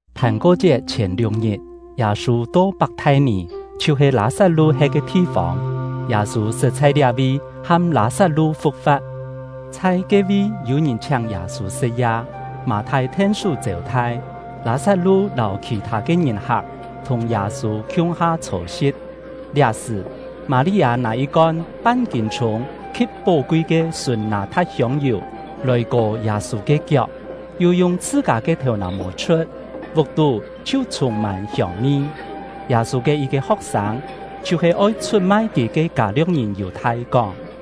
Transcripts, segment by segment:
Phàn-ko-chiet chhièn liuk-ngit, Yâ-sû to Pak-thai-nì, chhiu-he Lâ-sat-lu he̍t ke thi-fông (Yâ-sû sṳt chhai liá-vi ham Lâ-sat-lu fu̍k-fa̍t). Chhai ke-vi yû-ngìn chhiáng Yâ-sû sṳ̍t-ya; Mâ-thai then-sú chêu-thai, Lâ-sat-lu lâu khì-thâ ke ngìn-hak thùng Yâ-sû khiung-ha chhô-si̍t. Liá-sṳ̀, Mâ-li-â nâ yit-kon pan-kîn-chhûng khi̍t pó-kui ke sùn nâ-tha̍t hiông-yù, lòi kò Yâ-sû ke kiok, yu yung chhṳ-kâ ke thèu-nà-mô chhu̍t; vuk-tú chhiu chhûng-mân hiông-mi. Yâ-sû ke yit-ke ho̍k-sâng, chhiu-he oi chhut-mai kì ke Kâ-lio̍k-ngìn Yù-thai, kóng: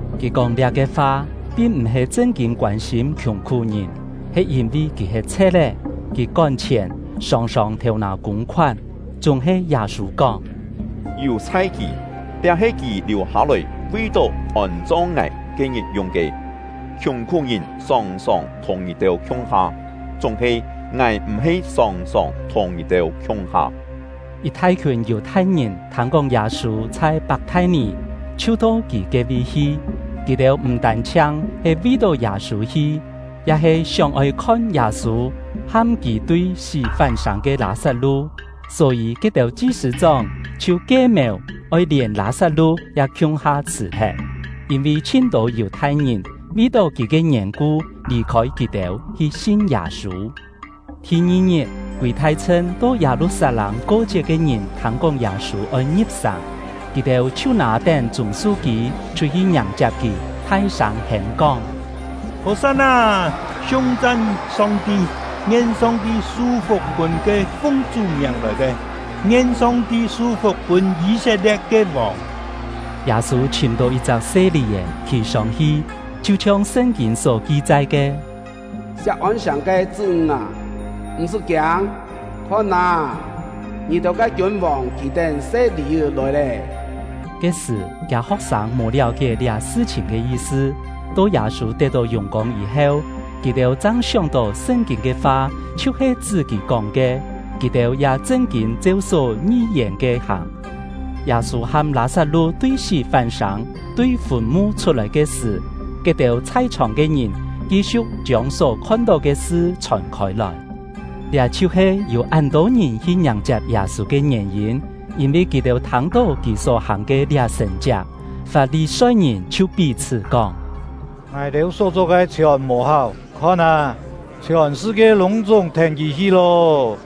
(Kì kóng liá-ke fa, pin m̀-he chṳn-kîn koân-sîm khiùng-khú-ngìn, he yîn-vi kì he chhe̍t-é; kì kón-chhièn, sòng-sòng thêu-nâ kûng-khoán.) Chúng-he Yâ-sû kóng: “Yù-chhai kì! Liá he kì liù-hâ-lòi vi-tó ngài ôn-chong ke-ngit yung ke. Khiùng-khú-ngìn sòng-sòng thùng ngì-têu khiung-ha, chúng-he ngài m̀-he sòng-sòng thùng ngì-têu khiung-ha!” Yit thai-khiùn Yù-thai-ngìn thâng-kóng Yâ-sû chhai Pak-thai-nì, chhiu to kì ke-vi hi. Kì-têu m̀ tân-chhiang he vi-tó Yâ-sû hi, ya he sióng-oi khon Yâ-sû ham kì tui sí fán-sâng ke Lâ-sat-lu. Só-yî, ke-têu chi-sṳ̂-chóng chhiu kie-mèu oi lièn Lâ-sat-lu ya khiung-ha chhṳ̀-thet, yîn-vi chhin-tô Yù-thai-ngìn vi-tó kì ke yèn-ku lì-khôi kì-têu, hi sin Yâ-sû. Thi-ngi-ngit, kûi thai-chhṳn to Yâ-lu-sat-lâng ko-chiet ke ngìn thâng-kóng Yâ-sû oi ngi̍p-sàng. Kì-têu chhiu nâ-tén chûng-su-kî chhut-hi ngiàng-chiap kì, thai-sâng hêm-kóng: Hò-san-nâ! Siung-chan Song-ti! Ngien Song-ti su-fuk pûn ke fung Chú miàng lòi ke! Ngien Song-ti su-fuk pûn Yî-set-lie̍t ke vòng! Yâ-sû chhìm-tó yit-chak se lì-è, khì sông-hi, chhiu-chhiong Sṳn-kîn só ki-chai ke: Siak-ôn-sàng ke chṳ́-ńg â, m̀-sṳ́ kiâng! Khon â, ngì-têu ke kiûn-vòng khì-tén se lì-è lòi lé! Ke-sṳ̀, kiâ ho̍k-sâng mò liáu-kié liá sṳ-chhìn ke yi-sṳ; to Yâ-sû tet-tó yùng-kông yî-heu, kì-têu chang sióng-tó Sṳn-kîn ke fa chhiu-he chṳ́ kì kóng ke, kì-têu ya chṳn-kîn cheu só yi-ngièn ke hàng. Yâ-sû ham Lâ-sat-lu tui sí fán-sâng, tui fùn-mu chhut-lòi ke sṳ̀, ke-têu chhai-chhòng ke ngìn ki-siu̍k chiông só khon-tó ke sṳ chhòn khôi-lòi. Liá chhiu-he yû án-tô ngìn hi ngiàng-chiap Yâ-sû ke ngièn-yîn, yîn-vi kì-têu thâng-tó kì só-hàng ke liá sṳ̀n-chiak. Fap-li-soi-ngìn chhiu pí-chhṳ́ kóng: “Ngài-têu só-cho ke chhiòn mò-háu; khon â, chhiòn sṳ-kie lûng-chúng thèn kì hi lô!”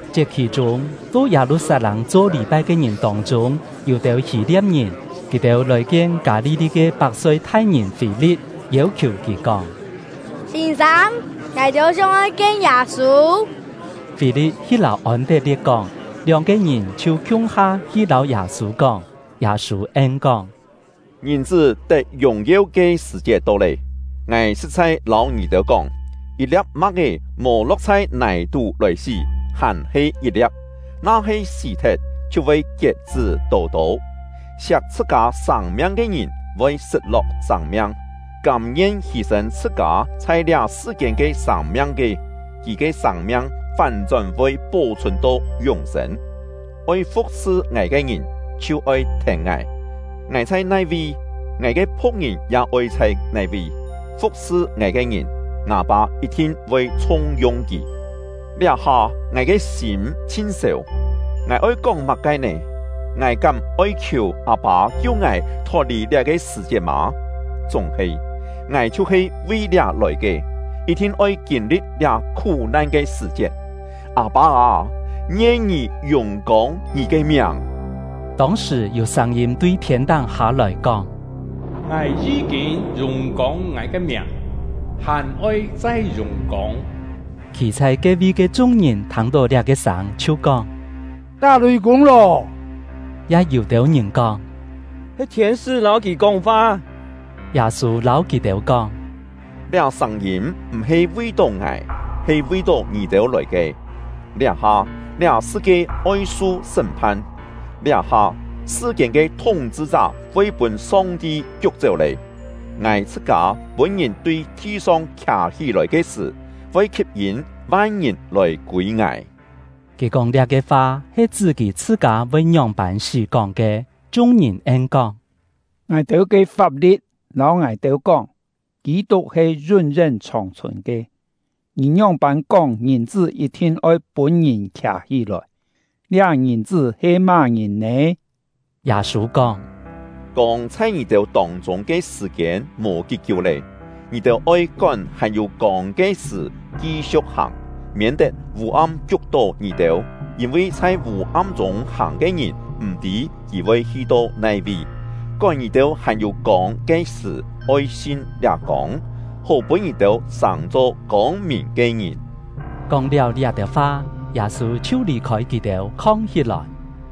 Chiet-khì-chûng, to Yâ-lu-sat-lâng cho lî-pai ke ngìn tông-chûng, yû-têu Hî-lia̍p-ngìn. Kì-têu lòi-kien Kâ-li-li ke Pak-soi-thai-ngìn Fî-li̍t, yêu-khiù kì kóng: “Sîn-sâng, ngài-têu sióng-oi kien Yâ-sû.” Fî-li̍t hi lâu Ôn-tet-lie̍t kóng, lióng-ke ngìn chhiu khiung-ha hi lâu Yâ-sû kóng. Yâ-sû en-kóng: “Ngìn-chṳ́ tet yùng-yeu ke sṳ̀-chiet to lé! Ngài sṳ̍t-chhai lâu ngì-têu kóng, yit-lia̍p ma̍k-é mò lo̍k chhai nài-tú lòi sí, hàn-he yit-lia̍p; na-he sí-thet, chhiu voi kiet-chṳ́ tô-tô. Siak chhṳ-kâ sâng-miang ke ngìn, voi sṳt-lo̍k sâng-miang; kâm-ngien hî-sên chhṳ-kâ chhai liá sṳ-kiên ke sâng-miang ke, kì ke sâng-miang fán-chón voi pó-chhùn to yún-sên. Oi fu̍k-sṳ ngài ke ngìn, chhiu oi thèn ngài; ngài chhai nai-vi, ngài ke phu̍k-ngìn ya oi chhai nai-vi. Fu̍k-sṳ ngài ke ngìn, ngâ Pâ yit-thin voi chhung-yung kì. “Liá-ha, ngài ke sîm chhin sèu, ngài oi kóng má-ke nè? Ngài kám oi khiù Â-pâ kiu ngài thot-lì liá-ke sṳ̀-chiet mò? Chúng-he, ngài chhiu-he vi liá lòi ke, yit-thin oi kîn-li̍t liá khú-nan ke sṳ̀-chiet. Â-pâ â, ngien Ngì yùng-kông Ngì ke miàng!” Tông-sṳ̀, yû sâng-yîm tui thiên-táng hâ-lòi, kóng: “Ngài yí-kîn yùng-kông Ngài ke miàng, hàn-oi chai yùng-kông!” Khî chhai ke-vi ke chung-ngìn thâng-tó liá-ke sâng, chhiu kóng: “Tá lùi-kûng lô!” Ya yû-têu ngìn kóng: “He thiên-sṳ́ lâu kì kóng-fa!” Yâ-sû lâu kì-têu kóng: “Liá sâng-yîm m̀-he vi-tó ngài, he vi-tó ngì-têu lòi ke. Liá-ha, liá sṳ-kie oi su sṳ́m-phan; liá-ha, sṳ-kiên ke thúng-chhṳ-chá voi pûn Song-ti kiuk-chéu lé. Ngài chhṳ-kâ pûn-ngìn tui thi-song khià-hí-lòi ke sṳ̀, voi khip-yîn van-ngìn lòi kûi ngài.” (Kì kóng liá-ke fa he chṳ́ kì chhṳ-kâ voi ngióng-pân sí kóng ke.) Chung-ngìn en-kóng: “Ngài-têu ke fap-li̍t lâu ngài-têu kóng, Kî-tuk he yún-yén chhòng-chhùn ke; ngì ngióng-pân kóng Ngìn-chṳ́ yit-thin oi pûn-ngìn khià-hí-lòi? Liá Ngìn-chṳ́ he má-ngìn nè?” Yâ-sû kóng: “Kông chhai ngì-têu tông-chûng ke sṳ̀-kiên mò kí-kiú lé; ngì-têu oi kón hàn-yû kông ke sṳ̀ ki-siu̍k hàng, miên-tet vû-am kiuk-tó ngì-têu, yîn-vi chhai vû-am-chûng hàng ke ngìn m̀-tî kì voi hi-to nai-vi. Kón ngì-têu hàn-yû kông ke sṳ̀ oi sin liá kông, hó pûn ngì-têu sàng-cho kông-mìn ke ngìn.” Yù-thai-ngìn M̀ Sin Kóng-liáu liá-têu fa, Yâ-sû chhiu lì-khôi kì-têu, khong-hí-lòi.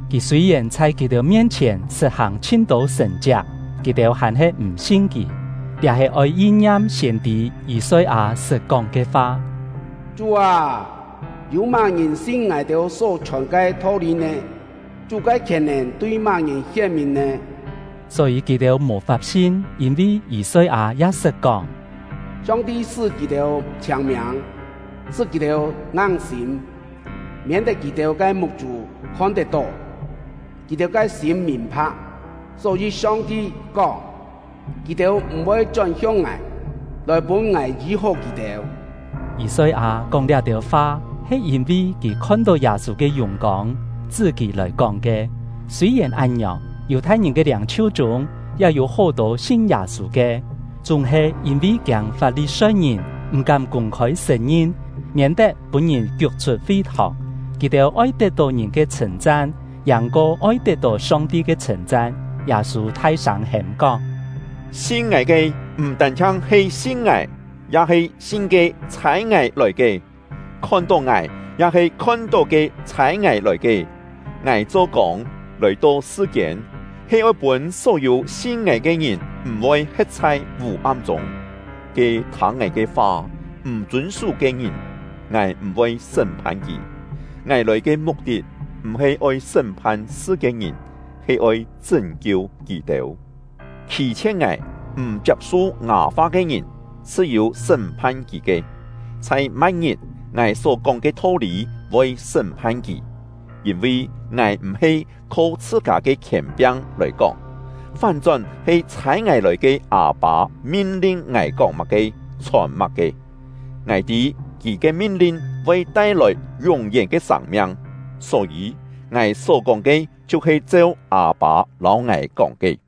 Kì sûi-yèn chhai kì-têu mien-chhièn sṳt hàng chhin-tô sṳ̀n-chiak, kì-têu hàn-he m̀ sin kì. Liá he oi yin-ngiam siên-tî Yî-soi-â sṳt kóng ke fa: Chú â, yû má-ngìn sin ngài-têu só chhòn ke tho-lî nè? Chú ke khièn-nèn tui má-ngìn hién-mìn nè? Só-yî kì-têu mò-fap sin; yîn-vi Yî-soi-â ya sṳt kóng: Song-ti sṳ́ kì-têu chhiâng-miâng, sṳ́ kì-têu ngang-sîm, miên-tet kì-têu ke muk-chû khon-tet-tó, kì-têu ke sîm mìn-pha̍k. Só-yî Song-ti kóng: Kì-têu m̀-voi chón-hiong Ngài, lòi pûn Ngài yî-hó kì-têu. Yî-soi-â kóng liá-têu fa he yîn-vi kì khon-tó Yâ-sû ke yùng-kông, chṳ́ kì lòi kóng ke. Sûi-yèn án-ngiòng, Yù-thai-ngìn ke liâng-chhiu chûng ya yû hó-tô sin Yâ-sû ke, chúng-he yîn-vi kiâng Fap-li-soi-ngìn, m̀-kám kûng-khôi sṳ̀n-ngin, miên-tet pûn-ngìn kiuk-chhut fi-thòng. Kì-têu oi tet-tó ngìn ke chhṳ̂n-chan, yàng-ko oi tet-tó Song-ti ke chhṳ̂n-chan. Yâ-sû thai-sâng hêm-kóng: “Sin ngài ke, m̀ tân-chhiang he sin ngài, ya he sin ke ‘Chhâi ngài lòi ke’. Khon-tó ngài, ya he khon-tó ke ‘Chhâi ngài lòi ke’. Ngài cho kông, lòi-to sṳ-kiên, he oi pûn só-yû sin ngài ke ngìn m̀-voi he̍t chhai vû-am-chûng. Ke thâng ngài ke fa, m̀ chûn-sú ke ngìn, ngài m̀-voi sṳ́m-phan kì. Ngài lòi ke muk-tit m̀-he oi sṳ́m-phan sṳ-kiên-ngìn, he oi chṳ́n-kiu kì-têu. Khî-chhie̍t ngài, m̀ chiap-su ngâ fa ke ngìn, chhṳ-yû sṳ́m-phan kì ke; chhai ma̍t-ngit, ngài só-kóng ke tho-lî voi sṳ́m-phan kì! Yîn-vi ngài m̀-he kho chhṳ-kâ ke khièn-piang lòi kóng, fán-chón he chhâi ngài lòi ke Â-pâ min-lin ngài kóng má-ke, chhòn má-ke. Ngài tî Kì ke min-lin voi tai-lòi yún-yén ke sâng-miang. Só-yî, ngài só-kóng ke chhiu-he cheu Â-pâ lâu ngài kóng ke.”